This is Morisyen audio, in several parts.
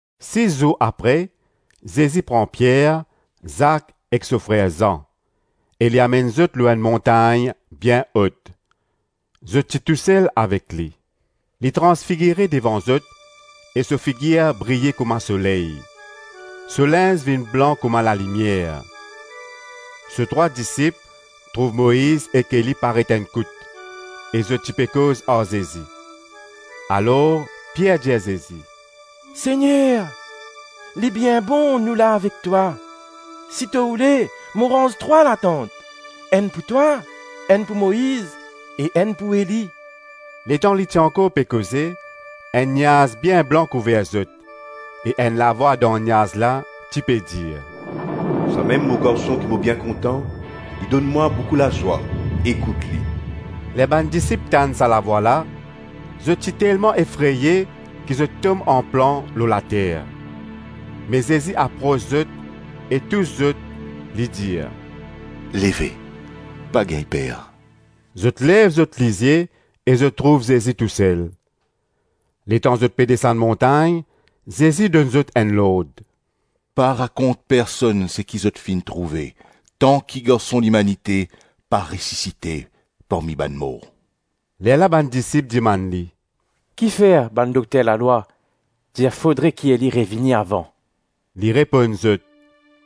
Sis zour apre, Zezi pran Pier, Zak ek so frer Zan e li amenn zot lor enn montagn bien ot. Zot ti tousel avek li. Li transfigire devan zot e so figir briye kouma soley, so linz vinn blan kouma lalimier. So trwa disip trouv Moiz ek Eli paret enn kout e zot ti pe koz ar Zezi. Alor Pier dir Zezi, “Segner, li bien bon nou la avek twa! Si to oule, mo ranz trwa latant, enn pou twa, enn pou Moiz e enn pou Eli.” Letan li ti ankor pe koze, enn niaz bien blan kouver zot e enn lavwa dan niaz la ti pe dir, “Samem mo Garson ki mo bien kontan, li donn mwa boukou lazwa, ekout li!” Ler bann disip tann sa lavwa la, zot ti telman efreye ki zot tom anplan lor later. Me Zezi apros zot e tous zot, li dir, “Leve, pa gagn per.” Zot lev zot lizie e zot trouv Zezi tousel. Letan zot pe desann montagn, Zezi donn zot enn lord, “Pa rakont personn seki zot finn trouve tanki Garson Limanite pa resisite parmi bann mor.” Lerla bann disip dimann li, “Kifer bann dokter lalwa dir fodre ki Eli revini avan?” Li reponn zot,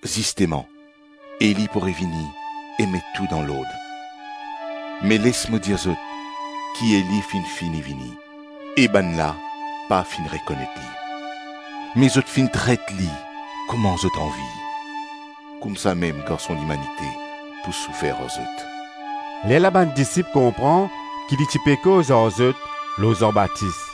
“Zisteman Eli pou revini e met tou dan lord. Me les mo dir zot ki Eli finn fini vini e bann la pa finn rekonet li, me zot finn tret li kouma zot anvi. Koumsamem Garson Limanite pou soufer ar zot.” Lerla bann disip konpran ki li ti pe koz ar zot lor Zan Batis.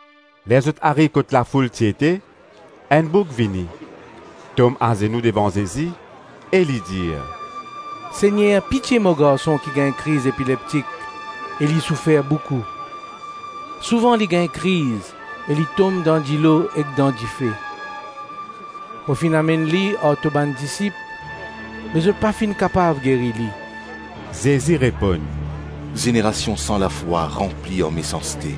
Ler zot ariv kot lafoul ti ete, enn boug vini, tom azenou devan Zezi, e li dir, “Segner, pitie mo garson ki gagn kriz epileptik e li soufer boukou. Souvan li gagn kriz e li tom dan dilo ek dan dife. Mo finn amenn li ar to bann disip me zot pa finn kapav geri li.” Zezi reponn, “Zenerasion san lafwa ranpli ar mesanste.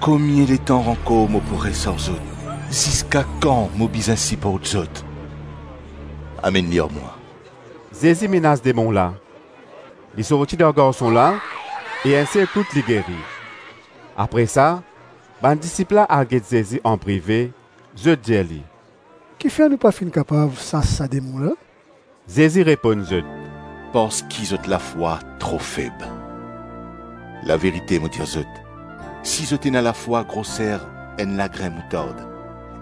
Komie letan ankor mo pou res ar zot? Ziska kan mo bizin siport zot? Amenn li ar mwa.” Zezi menas demon la, li sorti dan garson la e enn sel kout li geri. Apre sa bann disip al get Zezi anprive, zot dir li, “Kifer nou pa finn kapav sas sa demon la?” Zezi reponn zot, “Parski zot lafwa tro feb. Laverite mo dir zot, si zot ena lafwa groser enn lagrin moutard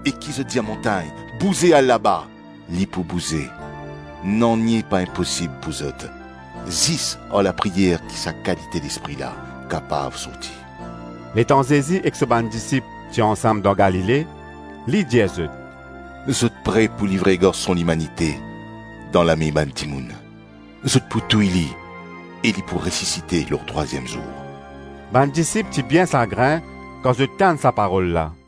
e ki zot dir montagn, ‘Bouze al laba,’ li pou bouze; nanye pa inposib pou zot. Zis ar lapriyer ki sa kalite lespri la kapav sorti.” Letan Zezi ek so bann disip ti ansam dan Galile, li dir zot, “Zot pre pou livre Garson Limanite dan lame bann dimoun, zot pou touy li e li pou resisite lor trwaziem zour.” Bann disip ti bien sagrin kan zot tann sa parol la.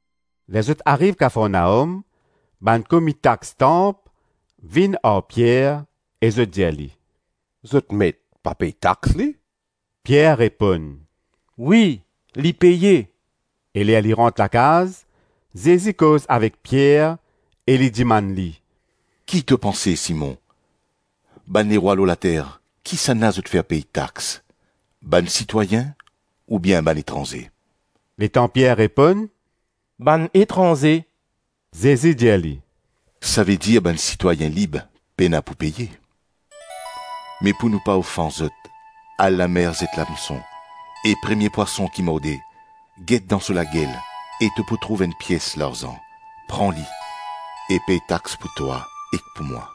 Ler zot ariv Kafarnaom, bann komi tax tanp vinn ar Pier e zot dir li, “Zot met, pa pey tax li?” Pier reponn, “Wi, li peye.” E ler li rant lakaz, Zezi koz avek Pier e li dimann li, “Ki to panse Simon, bann lerwa lor later, kisannla zot fer pey tax? Bann sitwayin oubien bann etranze?” Letan Pier reponn “Bann etranze,” Zezi dir li, “Savedir bann sitwayin lib, pena pou peye. Me pou nou pa ofans zot, al lamer zet lamson e premie pwason ki morde, get dan so lagel e to pou trouv enn pies larzan; pran li e pey tax pou twa ek pou mwa.”